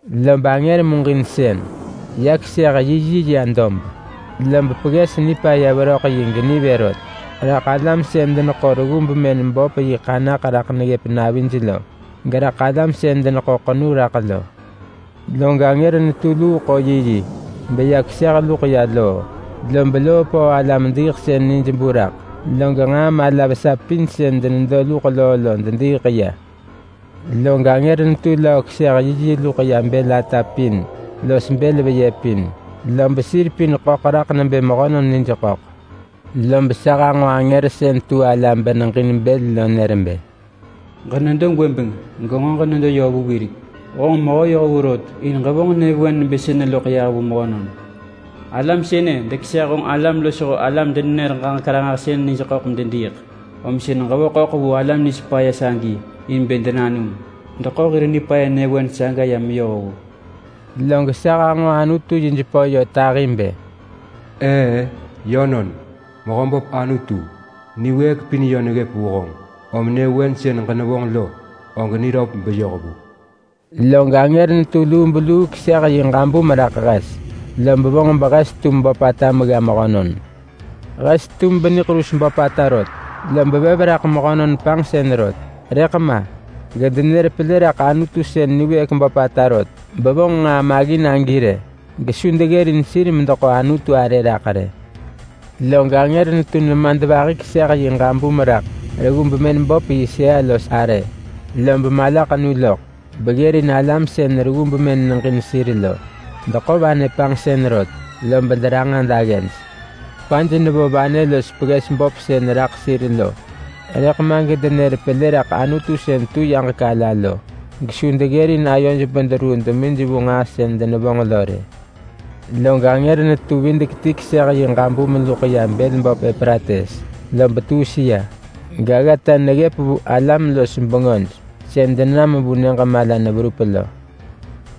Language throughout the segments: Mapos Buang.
Lob angër muġinsën ya keseh yi yi ya dob. Lob pegges nipaya veröḳ yi genivë rot raḳ alam sën deneḳo reggu bemën böp yi ḳanaḳ raḳ neggëp navij lo, geraḳ alam sën deneḳo ḳenu raḳ lo. Log angër netu luu ḳo yi yi, beya keseh luḳ ya loo. Lob loo pöö alam-diiḳsën nij bu raḳ, log nġaa mala vesa pin sën denedo luḳ loo lo dediiḳ ya. Log angër netu löö keseh yi yi luḳ ya bël ata pin los bël veyë pin. Lob sir pin ḳöḳ raḳ nebë mehönon nij ḳöḳ. Lob sa hanġo angër sën tu ala beneġin bël lo nër bë: “Ġenedo gwëbeng, genġo ġenedo yö vu wirek. Honġ mehö yohvu rot in ġevonġ nyëvewen nebë sënë loḳ yah vu mehönon. Alam sënë dekeseh honġ alam losho honġ alam-denenër-ġaġek-ranġahsën nij ḳöḳ medediiḳ, om sën ġevo ḳöḳ vu alam nij paya sagi in bë denanum. Deḳo hir nipaya nyëvewen saga ya meyoh vu.” Log sa hanġo Anutu yi jepö yö tahi bë: “Eë-ë, yönon, Mehöböp Anutu, niwëëk pin yö neggëp vu honġ, om nyëvewen sën ġenevonġ lo, og niröp beyoh vu.” Log angër netu lubeluu keseh yi ġabum raḳ hes, lob vonġ behes tum böpata megga mehönon. Hes tum beniḳerus böpata rot, lob vev raḳ mehönon panġsën rot. Rëḳ ma, gedenër pelë raḳ Anutu sën niwëëk böpata rot bevonġ nġaa maggin agi arë. Gesu deggërin sir medeḳo Anutu arë raḳ rë. Log angër netu nemadvahi keseh yi ġabum raḳ reggu bemën böp yi sëa-los-arë. Lob malaḳenu loḳ beggërin alam sën reggu bemën neġin sir lo. Deḳo vanë panġsën rot lob deranġa daggej. Kwaj nevo vanë los pegges böp sën raḳ sir lo, rëḳ ma gedenër pelë raḳ Anutu sën tu yaġek ala lo gesu deggërin ayoj bederuu demij vu nġaa sën denevonġ lo rë. Log angër netu videk ti keseh yi ġabum luḳ ya bël böp Eprates, lob tuus ya, gaggata neggëp vu alam-los-bengöj sën denam vu nyëġ mala neverup lo.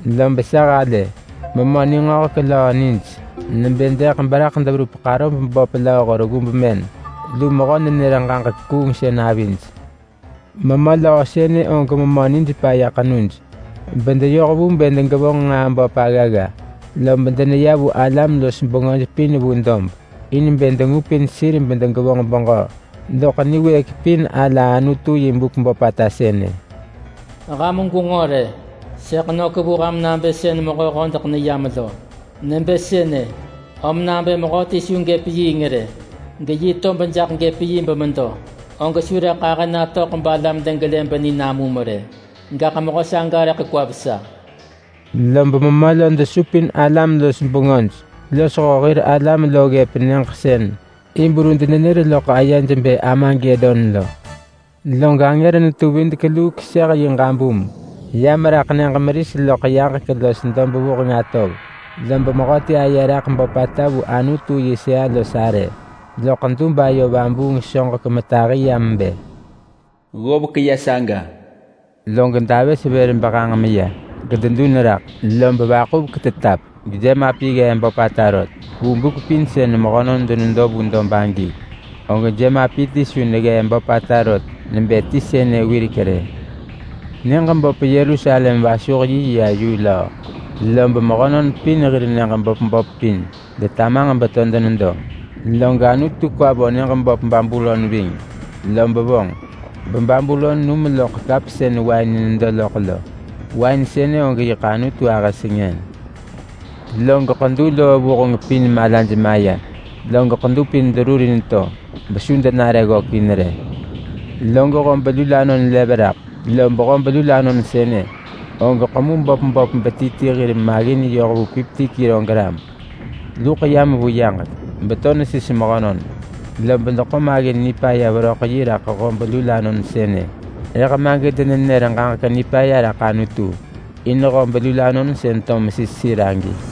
Lob sa halë memö ningöhek löö nij nebë deḳ, beraḳ deverup ḳarob böp lööho reggu bemën lu mehö-nenër-ġaġek-kuungsën avij. Memö löö sënë og memö nij paya ḳenuj, bedeyoh vu bë degevonġ nġaa böp aggagga. Lob deneya vu alam-los-bengöj pin vu dob, in bë dengupin sir bedegevonġ beġö doḳ Niwëëk Pin Ala Anutu yi buk böpata sënë. “Ham gwenġo rë! Sëḳ nök vu ham nabë sën mehö hodeḳ neyam lo. Nebë sënë, om nabë mehöti su gëp yiing rë, geyi tob jaḳ gëp yi bemedo, og su rëḳ ahë natöḳ balam degelë beninamum rë. Gaḳ mehö saga rëḳ kwa vesa!” Lob memö lo desupin alam-los-bengöj losho hir alam lo ggëp nyëġ sën Hibru denenër loḳ ayej bë Armagedon lo. Log angër netu videk luu keseh yi ġabum ya meraḳ nyëġ meris loḳ yaġek los dob vuheng atov. Lob mehöti aye raḳ böpata vu Anutu yi sëa-los-arë loḳ dub ayo vabuung soġek metahi yam bë, “Ggovek ya saga!” Log davës vër behang meya, gededun raḳ, lob vaḳuvek tetap, gejemapi ggee böpata rot. Vu buk pin sën mehönon denedo vu dob agi, og jemapi ti su neggee böpata rot nebë ti sënë wirek rë. Nyëġ böp Yerusalem vasuh yi ya yu löö, lob mehönon pin hir nyëġ böp böp pin detamanġ beto denedo. Log Anutu kwa vo nyëġ böp Babulon ving, lob vonġ ba, Babulon num loḳ kap sën wain nedo loḳ lo. Wain sënë og yiḳ Anutu ahë sengën. Log ḳedu loo vuheng pin malaj maya, log ḳedu pin derurin to, besu denare ggökin rë. Log hob lulanon lev raḳ. Lob hob lulanon sënë, og ḳemu böp böp beti ti hir maggin yoh vu padi bëëk ti. Luḳ yam vu yaġek beto nesis mehönon, lob deḳo maggin nipaya veröḳ yi raḳ hob lulanon sënë, rëḳ ma gedenenër ġaġek nipaya raḳ Anutu in hob lulanon sën to mesis sir agi.